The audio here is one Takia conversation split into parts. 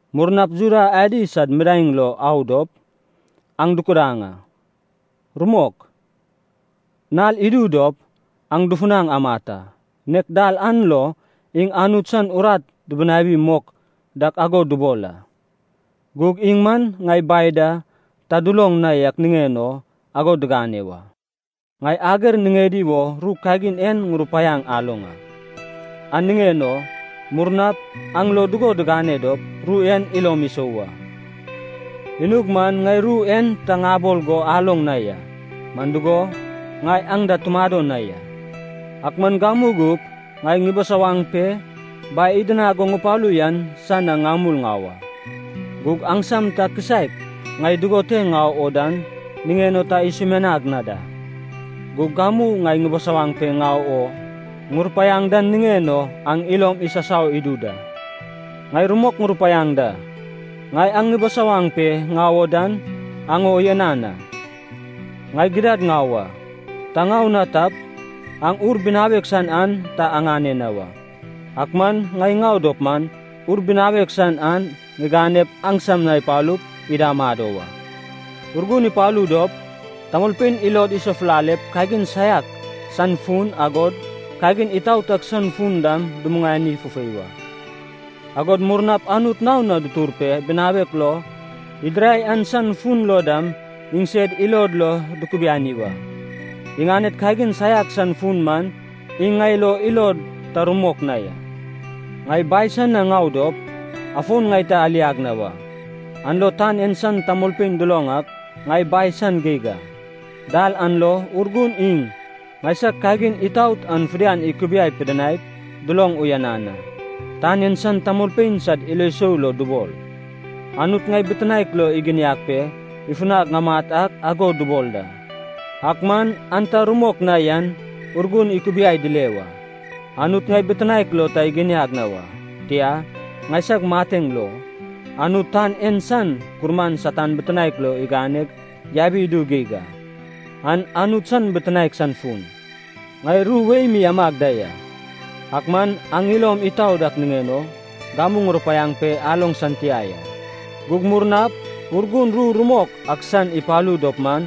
Murnap Juda adi sad midaeŋ lo au dop, aŋ dukudaŋ a. Rumok, nal idu dop, aŋ dufunaŋ amat a, nek dal an lo iŋ Anut san urat dibinawi mok dak ago dubol a. Gug iŋ man ŋai Bai da ta duloŋ na yak niŋen o ago digane wa. Ŋai ager niŋedi wo ru kagin en ŋurupaiaŋ aloŋ a, an niŋen o murnap aŋ lo dugo digane dop, ru en ilom isou wa. Inug man ŋai ru en ta ŋabol go aloŋ na ya, man dugo, ŋai aŋ da tumado na ya. “Ak man gamu gup ŋai ŋubisawaŋ pe, Bai idinag go ŋupalu yan san na ŋamul ŋau a. Gug aŋsam ta kisaek ŋai dugo te ŋau o dan niŋen o ta isumianag na da. Gug gamu ‘ŋai ŋubisawaŋ pe ŋau o’ ŋurupaiaŋ den niŋen o aŋ ilom isasau idu da. Ŋai rumok ŋurupaiaŋ da, ŋai aŋ ŋubisawaŋ pe ŋau o dan, aŋ o uyanan a. Ŋai gidad ŋau a. Ta ŋau na tap, aŋ Ur Binawek San an ta aŋane na wa. Ak man ŋai ŋau dop man, Ur Binawek San an ŋiganep, aŋsam na ipalup, ida amado wa. Urgun ipalu dop, tamolpein ilod isafulalep, kagin saiak san fun, agod kagin itaot ak san fun dam dumuŋani fufei wa. Agod murnap Anut naon na ditur pe bitinaek lo idirai an san fun dam iŋsed ilod lo dukubiani wa. Iŋaned kagin saiak san fun man iŋ ŋai lo ilod ta rumok na ya. Ŋai Bai san na ŋau dop, afon ŋai ta aliag na wa. An lo tan en san tamolpein duloŋ ak ŋai Bai san geig a. Dal an lo Urgun iŋ ŋaisag kagin itaot an fidian ikubiai pidinaip, duloŋ uyanan a. Tan en san tamolpein sad ilo sou lo dubol, Anut ŋai bitinaek lo iginiag pe ifunag ŋamat ak ago dubol da. Ak man an ta rumok na yan Urgun ikubiai dile wa. Anut ŋai bitinaek lo ta iginiag na wa, tia, ŋaisag mateŋ lo, Anut tan en san gurman Satan bitinaek lo iganeg yabi idu geig a. An Anut san bitinaek san fun. “Ŋai ru wei mi amag da ya, ak man aŋ ilom itau dak niŋen o, gamu ŋurupaiaŋ pe aloŋ san tia ya. Gug murnap Urgun ru rumok ak san ipalu dop man,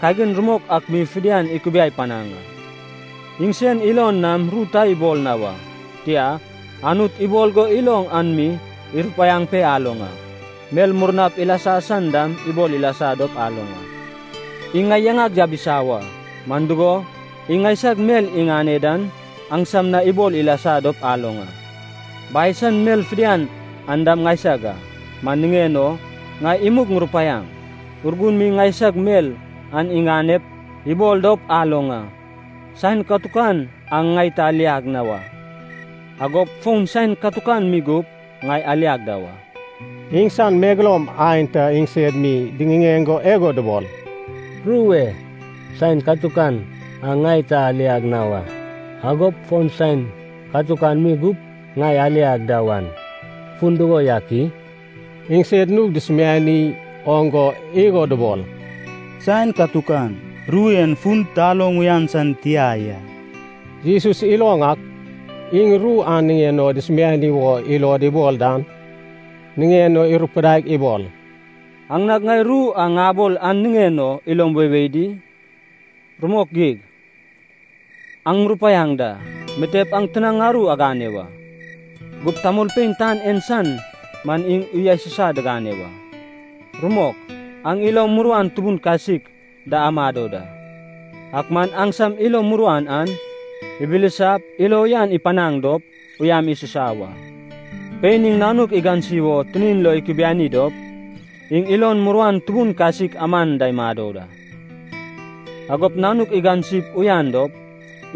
kagin rumok ak mi fidian ikubiai panaŋ a. Iŋ sen ilon nam ru ta ibol na wa. Tia, Anut ibol go iloŋ an mi irupaiaŋ pe aloŋ a. Mel murnap ilasa san dam ibol ilasa dop aloŋ a. Iŋ ŋai yaŋag yabisa wa, man dugo, iŋ ŋaisag mel iŋane dan aŋsam na ibol ilasa dop aloŋ a. Bai san mel fidian an dam ŋaisag a. Man niŋen o ŋai imug ŋurupaiaŋ, Urgun mi ŋaisag mel an iŋanep ibol dop aloŋ a.” “Saen katukan aŋ ŋai ta aliag na wa. Agop fon saen katukan mi gup, ŋai aliag da wa.” Iŋsan megeloum aenta iŋsed mi diŋiŋeŋ go igo dubol, “Ru e ‘saen katukan aŋ ŋai ta aliag na wa, agop fon saen katukan mi gup, ŋai aliag da wan’ fun dugo yak i?” Iŋsed nug dusumiani oŋ go igo dubol, “‘saen katukan’, ru en fun taloŋ uyan san tia ya.” Jesus iloŋ ak, iŋ ru an niŋen o dusumiani wo ilod ibol dan, niŋen o irupudaig ibol, “Aŋ nag ŋai ru a ŋabol an niŋen o ilom weiwei di? Rumok geig, aŋ ŋurupaiaŋ da, mitep aŋ tinaŋ aru agane wa. Gup tamolpein tan en san man iŋ uya susai digane wa. Rumok, aŋ ilo muruan tubun kasik da amado da, ak man aŋsam ilo muruan an ibilisap ilo uyan ipanaŋ dop, uyam isusa wa. Pein iŋ nanuk igansi wo tinin lo ikubiani dop, iŋ ilon muruan tubun kasik aman da imado da. Agop nanuk igansip uyan dop,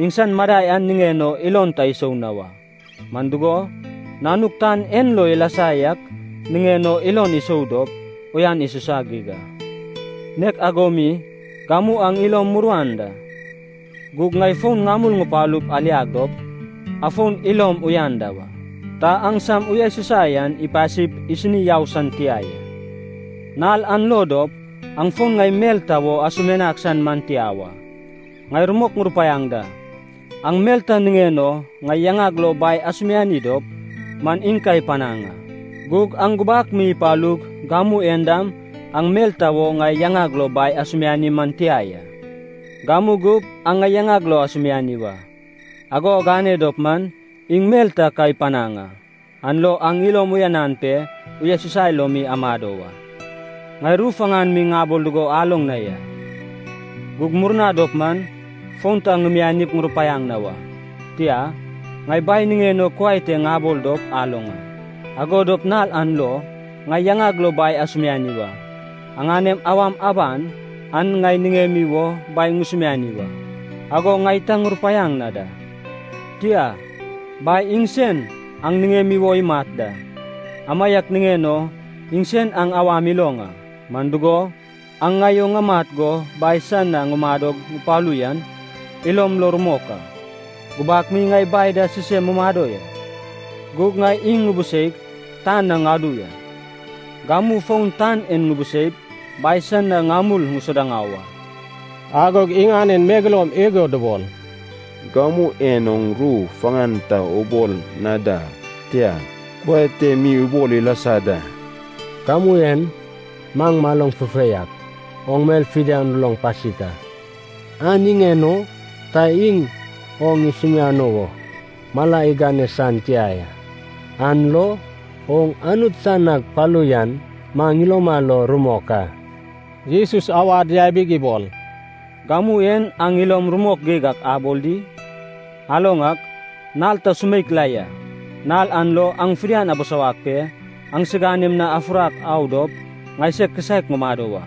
iŋsan madai an niŋen o ilon ta isou na wa. Man dugo, nanuk tan en lo ilasa yak niŋen o ilon isou dop, uyan isusa geig a. Nek ago mi, gamu aŋ ilom muruan da. Gug ŋai fon ŋamul ŋupalup aliag dop, afon ilom uyan da wa. Ta aŋsam uyasusai an ipasip isini yau san tia ya. Nal an lo dop, aŋ fon ŋai mel ta wo asumianag san man tia wa. Ŋai rumok ŋurupaiaŋ da, aŋ mel ta niŋen o ŋai yaŋag lo Bai asumiani dop, man iŋ ka ipanaŋ a. Gug aŋ gubak mi ipalug gamu en dam aŋ mel ta wo ŋai yaŋag lo Bai asumiani man tia ya. Gamu gup aŋ ŋai yaŋag lo asumiani wa. Ago agane dop man, iŋ mel an ka ipanaŋ a. An lo aŋ ilom uyanan pe, uyasusai lo mi amado wa.” “Ŋai ru faŋan mi ŋabol dugo aloŋ na ya. Gug murna dop man, fon ta ŋimianip ŋurupaiaŋ na wa. Tia, ŋai Bai niŋen o kuai te ŋabol dop aloŋ a. Ago dop nal an lo, ŋai yaŋag lo Bai asumiani wa. Aŋanem awam aban an aŋ niŋemi wo Bai ŋusumiani wa, ago ŋai ta ŋurupaiaŋ na da. Tia, Bai iŋsen aŋ niŋemi wo imat da. Amaiak niŋen o iŋsen aŋ awam iloŋ a. Man dugo, aŋ ŋai o amat go Bai san na ŋumadog ŋupalu yan, ilom lo rumok a. Gubak mi ŋai Bai da sisem mumado ya. Gug ŋai iŋ ŋubuseig, tan na ŋadu ya. Gamu fon tan en ŋubuseip, Bai san na ŋamul ŋusuda ŋau a.” Agog iŋanen megeloum igo dubol, “Gamu en oŋ ru faŋan ta ubol na da, tia, kuai te mi ubol ilasa da. Gamu en maŋ maloŋ fufei ak, oŋ mel fidian uloŋ pasik a. An niŋen o ta iŋ oŋ isumiano wo mala igane san tia ya. An lo oŋ Anut san nag palu yan maŋ iloma lo rumok a.” Jesus awad yabig ibol, “Gamu en aŋ ilom rumok geig ak abol di? Aloŋ ak, nal ta sumeik la ya, nal an lo aŋ fidian abisawag pe, aŋsiganem na afufurak au dop ŋaiseg kisaek ŋumado wa.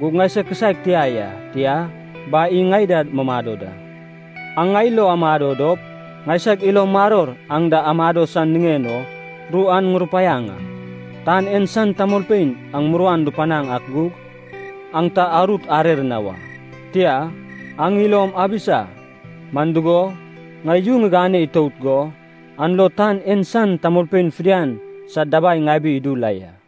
Gug ŋaiseg kisaek tia ya, tia, Bai iŋ ŋai da mumado da. Aŋ ŋai lo amado dop, ŋaisag ilo maror aŋ da amado san niŋen o ru an ŋurupaiaŋ a. Tan en san tamolpein aŋ muruan dupanaŋ ak gug, aŋ ta arut arer na wa. Tia, aŋ ilom abisa, man dugo, ŋai yu ŋigane itout go, an lo tan en san tamolpein fidian sad dabai ŋabi idu la ya.”